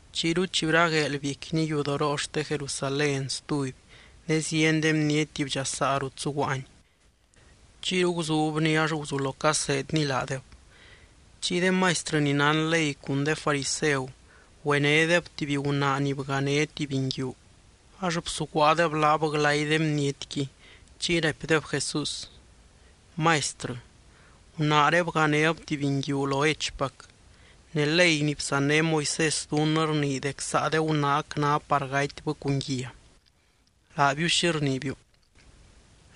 Chiyru chi bragueel biecquiny yudoroo xte Jerusalén stuby ne zieny de bniety bdxasaa rut zuguaany. Chiyru guzubny ax guzulo caseedny laadeb. Chiy de maistrɨ ni nán ley cun de fariseu güenédeb tuby gunaa ni bgané tuby nguiu, ax bsuguaadeb laab glay de bnietqui. Chiy raipdeb Jesús: —Maistrɨ, gunaaré bganéb tuby nguiu lo hechpac. Ne ley ni bsanné Moisés dunnɨ rnii dec saa de gunaac ná par gatybɨ cun guia. Laabiu, ¿xi rniibiu?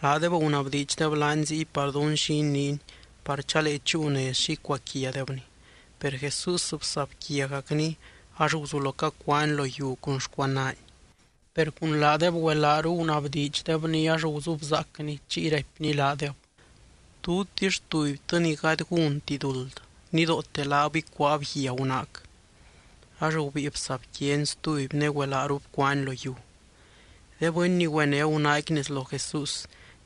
Laadeb gunabdiidxdeb laany ziy par dún xi iniiny par chalee chúu nez xi icuaquiadebny. Per Jesús bsabquiagacny ax guzulo cacuaany lo yiu cun xcuanaany. Per cun laadeb güelaaru gunabdiidxdebny ax guzubzaacny, chiy raipny laadeb: —Tutix tubytɨ ni gady gúnti duld, nidoote laab ícuaab guia gunaac. Ax gubíi bsabquiany stuby ne güelaaru bcuaany lo yiu. De bɨny ni güené gunaaqui nez lo Jesús,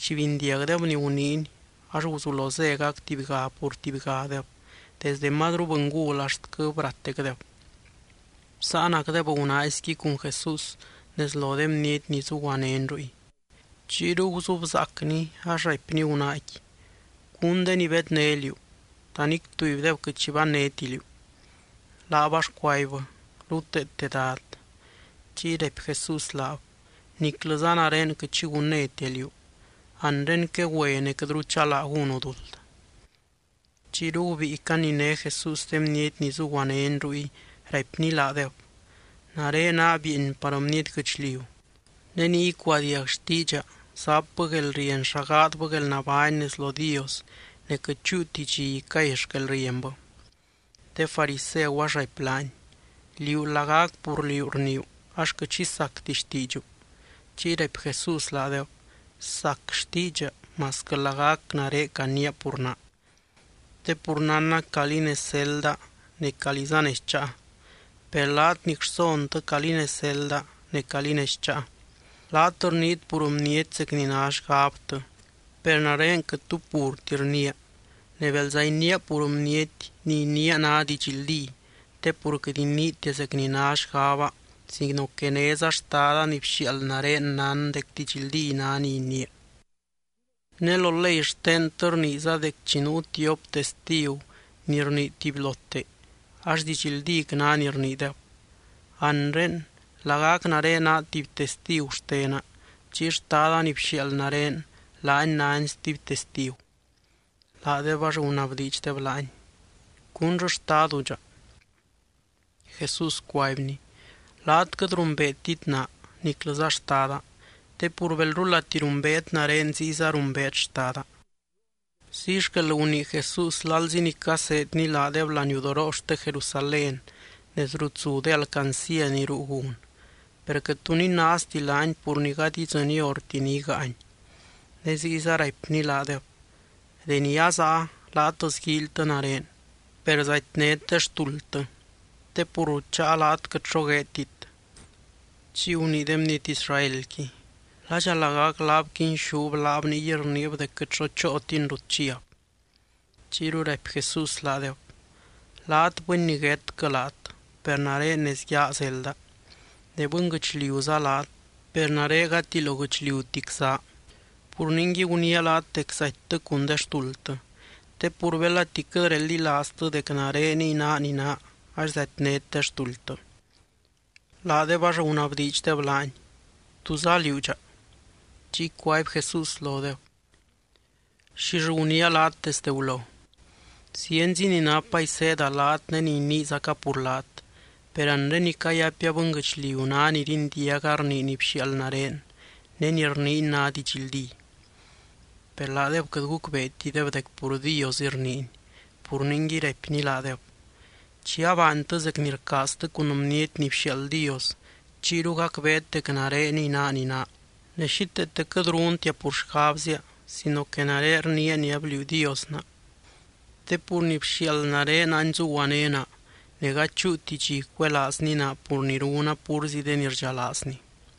chi bindiagdeb ni guniiny ax guzulo zégac tubyga pur tubygadeb desdɨ mazru bɨngul axtquɨ brateecdeb. Bsáanacdeb gunaaizqui cun Jesús nez lo de bniety ni zuguanény ruy. Chiyru guzubzaacny ax raipny gunaaqui: —¿Cún de ni bedné liú? ¿Ta nic tubydeb quɨt xi bannéti liú? Laab ax cuaibbɨ: —Ruteete, Dad. Chiy raipy Jesús laab: —Niclɨza nare quɨt xi gunnétia liú. Anre quegüe ne quɨtru chalaa gúnu duld. Chiyru gubíi caniné Jesús de bniety ni zuguanény ruy raipny laadeb: —Nare naa bieeny par bniety guɨchliu. Ne ni icuadiag xtiidxa zapbɨ guelrieny xa gaadbɨ guelnabány nez lo Dios, ne quɨt chúuti dxi icay xquelrienbɨ. De fariseu ax raipy laany: —Liú lagac pur liú rniiu ax quɨt xi sacti xtiidxu. Chiy raipy Jesús laadeb: —Sac xtiidxa masquɨ lagac nare caniia pur naa. Te pur nánna calí nez zelda ne calíza nez cháa. Per laat nic rsontɨ calí nez zelda ne calí nez cháa. Laat rniit pur bniety zec ni ná xgabtɨ. Per nare quɨt tu purti rniia. Ne belza iniia pur bniety, ni iniia ná didxldí. Te pur quɨt iniitia zec ni ná xgaba sino que néza Xtada ni bxiaald nare nán dec didxldí ná ni iniia. Ne lo ley xtentɨ rniiza dec chi nuu tiop testigu ni rnii tubylote ax didxldíc ná ni rniideb. Anre, lagac nare naa tuby testigu xtena, chiy Xtada ni bxiaald nare laany nány stuby testigu. Laadeb ax gunabdiidxdeb laany: —¿Cúnllɨ xtadu dxa? Jesús cuaibny: —Laat quɨt rumbeetit naa, niclɨza Xtada. Te pur belrulati rumbeet nare ziyza rumbeet Xtada. Ziy xquel gunii Jesús lalzi ni caseedny laadeb laniudoroo xte Jerusalén nez rut zu de alcancía ni ruu gun. Per quɨt tu ninaazti laany, pur ni gady idzɨny horti ni igáany. Ne ziyza raipny laadeb: —Deni azaa, laat sguíilytɨ nare, per zatynét de xtuldtɨ. Te pur rut cháa, laat quɨt xo gueedtit. Chiy gunii de bniety Israelqui: —¿Ladxa lagac laab quinxúb laab, ningui rniib dec quɨt xo chootin rut chiab? Chiyru raipy Jesús laadeb: —Laat bɨny niguétquɨ laat, per nare nez yaa zelda. Ne bɨnguɨchliuza laat, per nare gati lo guɨchliutic zaa. Pur ningui guniia laat dec zatytɨ cun de xtuldtɨ. Te pur belati quɨt reldilaaztɨ dec nareniy naa ni naa ax zatynét de xtuldtɨ. Laadeb ax gunabdiidxdeb laany: —¿Túza liú dxa? Chiy cuaby Jesús lodeb: —¿Xill guniia laat desde gulo? Zienzi ni napa iseeda laat ne ni iniizaca pur laat. Per anre ni cayapia bɨnguɨchliu ná ni rindiaga rnii ni bxiaald nare, ne ni rniiny ná didxldí. Per laadeb quɨt gucbeetideb dec pur Diosɨy rniiny. Pur ningui raipny laadeb: —Chi abaantɨ zec ni rcaaztɨ cun Bniety ni bxiaald Dios, chiyru gacbeet dec nareniy naa ni naa. Ne xíteete quɨt runtia pur xgabzia sino que nare rniia ni abliuu Dios naa. Te pur ni bxiaald nare any zuguané naa. Ne gady chúuti dxi cuelaazny naa pur ni runa púrzi de ni rdxalaazny.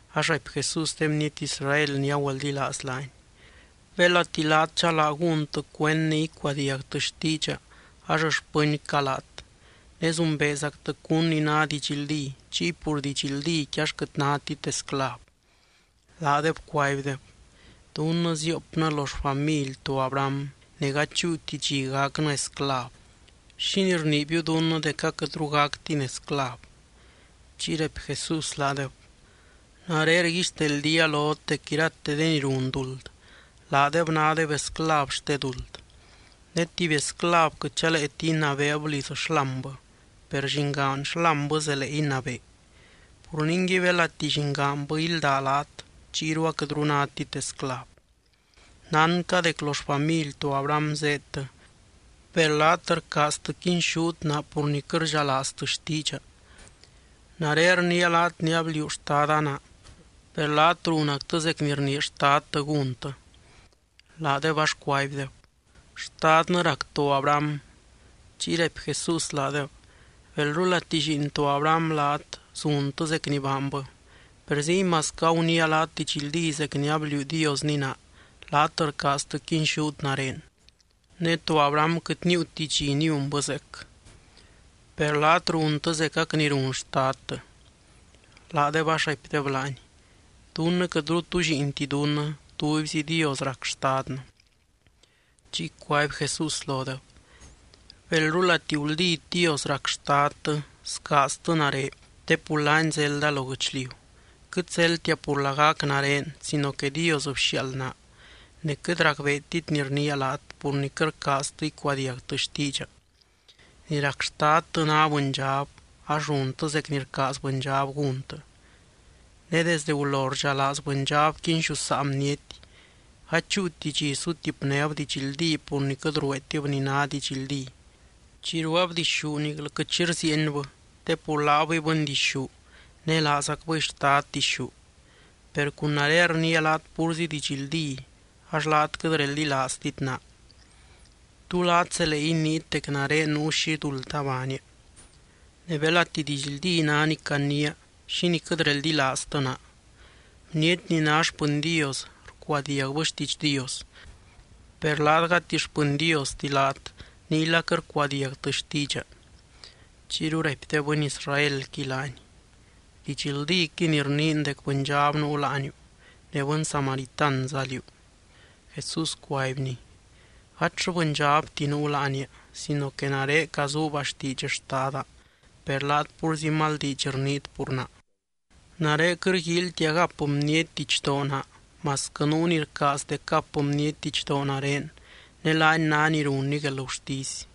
Ax raipy Jesús de bniety Israel ni agüeldilaaz laany: —Belati laat chalaa gúntɨ cuend ne icuadiagtɨ xtiidxa ax xpɨncaa laat. Ne zumbeezactɨ cún ni ná didxldí, chiy pur didxldíqui ax quɨt nátit esclav. Laadeb cuaibdeb: —Dunnɨ ziopnɨ lo xfamily to Abraham, ne gady chúuti dxi gacnɨ esclav. ¿Xínii rniibiu dunnɨ dec aquɨtru gactin esclav? Chiy raipy Jesús laadeb: —Nare rguixteldía lot dec irate de ni run duld, laadeb nádeb esclav xte duld. Ne tuby esclav quɨt chaleeti inabeeb liz xlámbɨ, per llingaan xlámbɨ zelee inabee. Pur ningui belati llingaanbɨ ílda laat, chiyru aquɨtru nátit esclav. Nánca dec lo xfamily to Abraham zéedtɨ. Per laat rcaaztɨ quinxút naa pur ni quɨt rdxalaaztɨ xtiidxa. Nare rniia laat ni abliuu Xtada naa, per laat runactɨ zec ni rnii xtadtɨ gúntɨ. Laadeb ax cuaibdeb: —Xtadnɨ rac to Abraham. Chiy raipy Jesús laadeb: —Belrulati lliin to Abraham laat, zuntɨ zec ni baanbɨ. Per ziy masquɨ aguniia laat didxldí zec ni abliuu Diosni naa, laat rcaaztɨ quinxút nare. Ne to Abraham quɨt níiuti dxi niunbɨ zeec. Per laat runtɨ zecac ni run xtadtɨ. Laadeb ax raipdeb laany: —Dunnɨ quɨtru tu lliinti dunnɨ. Tubyzi Dios rac xtadnɨ. Chiy cuaby Jesús lodeb: —Belrulati guldít Dios rac xtadtɨ, scaaztɨ nare te pur laany zelda lo guɨchliu. Quɨt zeldtia pur lagac nare sino que Dios bxiaald naa. Ne quɨt racbeetit ni rniia laat, pur ni quɨt rcaaztɨ icuadiagtɨ xtiidxa. Ni rac xtadtɨ ná bɨndxab. Ax runtɨ zec ni rcaaz bɨndxab gúntɨ. Ne desdɨ gulo rdxalaaz bɨndxab quinxusaa bniety. Gady chúuti dxi sutipnéb didxldí pur ni quɨt rueetib ni ná didxldí. Chi rueeb dixú niclɨ quɨt xi rziienbɨ te pur laabɨy bɨndixú ne laazacbɨy xtad dixú. Per cun nare rniia laat púrzi didxldí, ax laat quɨt reldilaaztit naa. ¿Tú laat zelee inii dec nare nuu xi duld abaania? Ne belati didxldí ná ni caniia, ¿xínii quɨt reldilaaztɨ naa? Bniety ni ná xpɨny Dios, rcuadiagbɨ xtiidx Dios. Per laat gati xpɨny Diosti laat, niyla quɨt rcuadiagtɨ xtiidxa. Chiyru raipy de bɨny Israelqui laany: —Didxldíquɨy ni rniin dec bɨndxab nuu láaniu ne bɨny Samaritanza liú. Jesús cuaibny: —Gatllɨ bɨndxabti nuu láania sino que nare cazuuba xtiidx Xtada, per laat púrzi mal diidx rniit pur naa. Nare quɨt rguíilytia gap bniety didxdoo naa masquɨ nuu ni rcaaz dec gap bniety didxdoo nare ne laany ná ni runny guelgurtisy.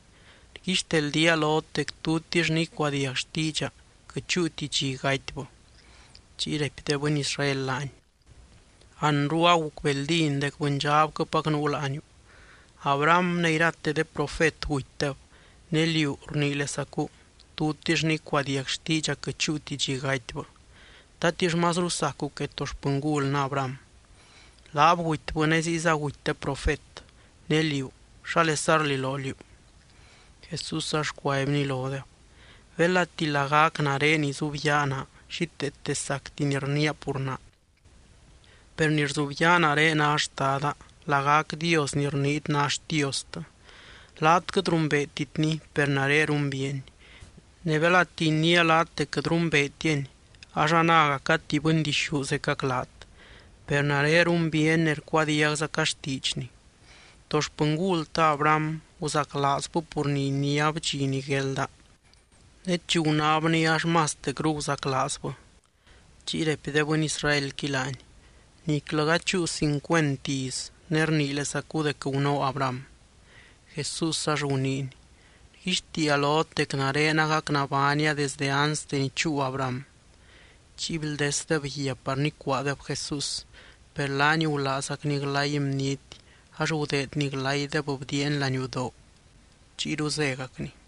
Rguixteldía lot dec tutix ni icuadiag xtiidxa, quɨt chúuti dxi gatybɨ. Chiy raipy de bɨny Israel laany: —Anru agucbeldín dec bɨndxabquɨpac nuu láaniu. Abraham ne irate de profet gutydeb. Ne liú rniilesacu: “Tutix ni icuadiag xtiidxa quɨt chúuti dxi gatybɨ.” ¿Tatix mazru sacu que to xpɨngulnɨ Abraham? Laab gutybɨ ne ziyza guty de profet. Ne liú, ¿xálesa rliloo liú? Jesús ax cuaibny lodeb: —Belati lagac nare izubyaa naa, xíteete sacti ni rniia pur naa. Per ni rzubyaa nare ná Xtada, lagac Dios ni rniit ná Xtiostɨ. Laat quɨt rumbeetitny, per nare rumbiiany. Ne belati iniia laat dec quɨt rumbeetiany, ax anágaca tuby bɨndixú zecac laat. Per nare rumbiiany ne rcuadiagzaca xtiidxny. To xpɨngultɨ Abraham guzaclaazbɨ pur ni iniáb dxi ni guelda. Ne chi gunábni ax mastecru guzaclaazbɨ. Chiy raipy de bɨny Israelqui laany: —Niclɨ gady chúu cincuent iz, ne rniilesacu dec gunóo Abraham. Jesús ax guniiny: —Rguixtiia lot dec nare agac nabánia desde anste ni chúu Abraham. Chiy bldesdeb guia par nicuaadeb Jesús. Per laany gulaazgacny glay bniety ax gudeedny glaydeb bdiiany laniudoo, chiyru zégacny.